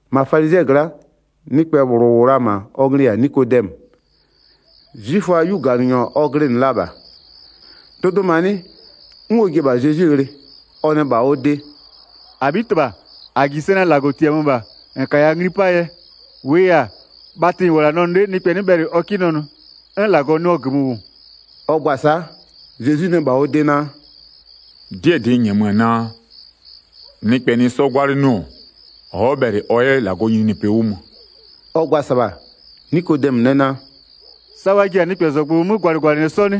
1-Ma falizɩɛ gla'a, nɩkpɛ -bhlʋ -wʋ la-a -ma, ɔ nglɩ-ɩ -yɛ-a Nikodɛmö, 'zwiföaa 'yuganɩnyɔ ɔ glɩnɩ la -bha. Dʋdʋmanɩ 'n ɔ ji-e -bha Zezwi ghlɩ. Ɔ nɛ -bha ɔ de: “-Abhitɩbha, -a -ji sɛ naa -Lagɔ -tiamö -bha -n -kaya ngli 'paa yɛ, -wʋʋ yɛ-a, bhatɩ -n -wʋ-ɔ -la nɛ nʋ 'le nɩkpɛ 'nɩ bhɛlɩ ɔ 'kɩ nɛ nʋ, 'n -Lagɔ nɩɔ -gömö -wʋ.” Ɔ gba-a sa'a, Zezwi nɛ -bha ɔ de naa: “'Dɩɛ -dɩ n -nyɛmö-a naa: Nɩkpɛ nɩ 'sɔ 'gwalɩnɩɔ-ɔ, ɔ'ɔ bhɛlɩ ɔ 'yɛ -Lagɔɔ nyininyinipɩ 'wʋ mö.” Ɔ gba-a -sɩbha, Nikodɛmö nɛ naa: “Sa wa ji-a nɩkpɛzɔgblʋ 'mö gwalɩgwalɩnɩɛ 'sɔ 'nɩ?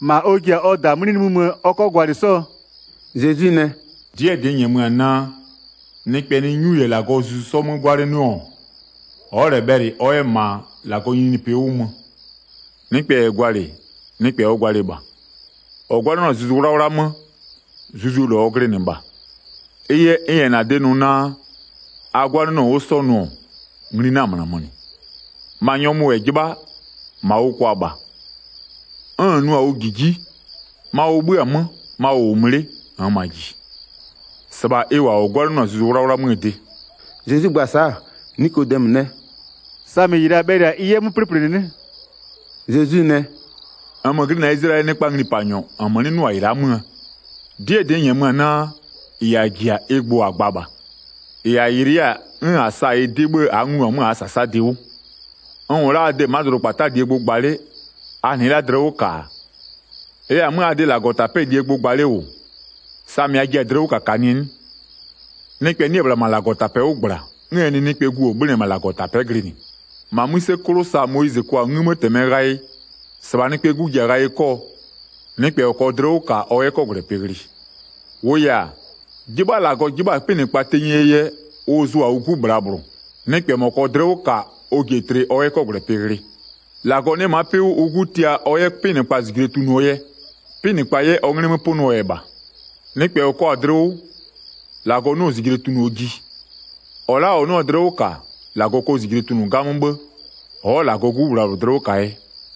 -Ma ɔ ji-a ɔ -daa 'mlɩ nimï möö ɔ 'kɔ gwalɩ 'sɔɔ?” Zezwi nɛ: “'Dɩɛ -dɩ n -nyɛmö-a naa, nɩkpɛ nɩ 'nyu -yɛ -Lagɔɔ Zuzu 'sɔ 'mö 'gwalɩnɩɔ-ɔ, ɔ'ɔ -lɛ bhɛlɩ ɔ 'yɛ -ma -Lagɔɔ nyininyinipɩ 'wʋ mö. Nɩkpɛ -yɛ gwalɩ, nɩkpɛ ɔ gwalɩ -bha, -ɔ 'gwalɩnɩɔ-a Zuzu 'Wlawla 'mö, Zuzuo -lɔ ɔ glɩnɩ -bha. N -yɛ -na de nʋ naa: A 'gwalɩnɩɔ 'wʋ 'sɔ nʋ-ɔ, ngli 'na-a -mönamö -nɩ. Ma nyɔmʋ -yɛ 'jɩbha, -ma ʋ kwa -bha, 'n -n nʋ-a ʋ -jiji, ma ʋ 'bhö-a 'mö, ma ʋ -wʋ mö 'le, -nn -ma -ji. -Sɩbha ɩ -wʋ-a -ɔ 'gwalɩnɩɔ-a Zuzu 'Wlawla 'möö de.” Zezwi gba-a sa'a, Nikodɛmö nɛ: “Samɩ -ɩ -la bhɛlɩ-a ɩ 'yɛ 'mö 'plɩplɩnɩ 'nɩ?” Zezwi nɛ: “-Nmö glɩnɩ-a Izlayɛlɩɛ nɩkpaa nglipanyɔ -nmö 'nɩ 'nʋ-a -ɩ la'a 'möö? 'Dɩɛ -dɩ n -nyɛmö-a naa: -Ɩ -a -ji-a ɩ gbʋ -a gba -bha, -ɩ -a yɩlɩ 'yɛ-a 'n -a sa-a ɩ 'dɩ 'bhë a'a nglu-a 'mö -aa -sasadɩ 'wʋ. N -wʋ la'a a de ma'a dʋdʋkpata'aa -lie gbʋ gba 'le, a 'nɩɩ la'a dlɩ 'wʋ -ka-a, n -yɛ-a 'mö a de -Lagɔtapɛ'ɛɛ -lie gbʋ gba 'le -wʋ, samɩ a jiɩ-a dlɩ 'wʋ -kakanɩɛ 'nɩ? Nɩkpɛ 'nɩ-ɛ -bhla -ma -Lagɔtapɛ'ɛ -gbla, 'n ɛ nɩ Nɩkpɛɛ Gu -ɔ 'bhönɩ-ɛ -ma -Lagɔtapɛ'ɛ glɩnɩ. 14-Ma 'mïse 'klʋ sa Moyizɩ kwa-a 'ngïmëtɩmɛ ghayɩ, -sɩbha Nɩkpɛɛ 'Gu ji-a ghayɩ 'kɔɔ, nɩkpɛ -ɔ -kɔɔ dlɩ 'wʋ -ka, ɔ 'yɛ 'kɔgwlɛpɩ ghlɩ. 16-Wʋʋ yɛ-a, 'jɩbha -Lagɔ 'jɩbha-a 'pɩnɩkpa tenyie yɛ, ʋ zʋ-a ʋ 'Gu -bhlabhlʋ, nɩkpɛ -mɔ -kɔɔ dlɩ 'wʋ -ka, ɔ ji-e tlɩ ɔ 'yɛ 'kɔgwlɛpɩ ghlɩ. 17-Lagɔ 'nɩ-ɛ ma'a 'pɩ 'wʋ ʋ 'Gu tia ɔ 'yɛ 'pɩnɩkpa -zijle tunʋɔ yɛ, 'pɩnɩkpa 'yɛ ɔ 'nglɩ 'mö 'pʋnʋɔ yɛ -bha. Nɩkpɛ -ɔ kɔ-a dlɩ 'wʋ, -Lagɔ 'nɩɔ-ɔ -zijle tunʋɔ ji, -ɔ la'a -ɔ 'nɩɔ-a dlɩ 'wʋ -ka, -Lagɔ kɔ -zijle tunʋ 'gamö 'bhë, ɔ'ɔ -Lagɔɔ 'Gu -bhlabhlʋ dlɩ 'wʋ -kaa yɛ.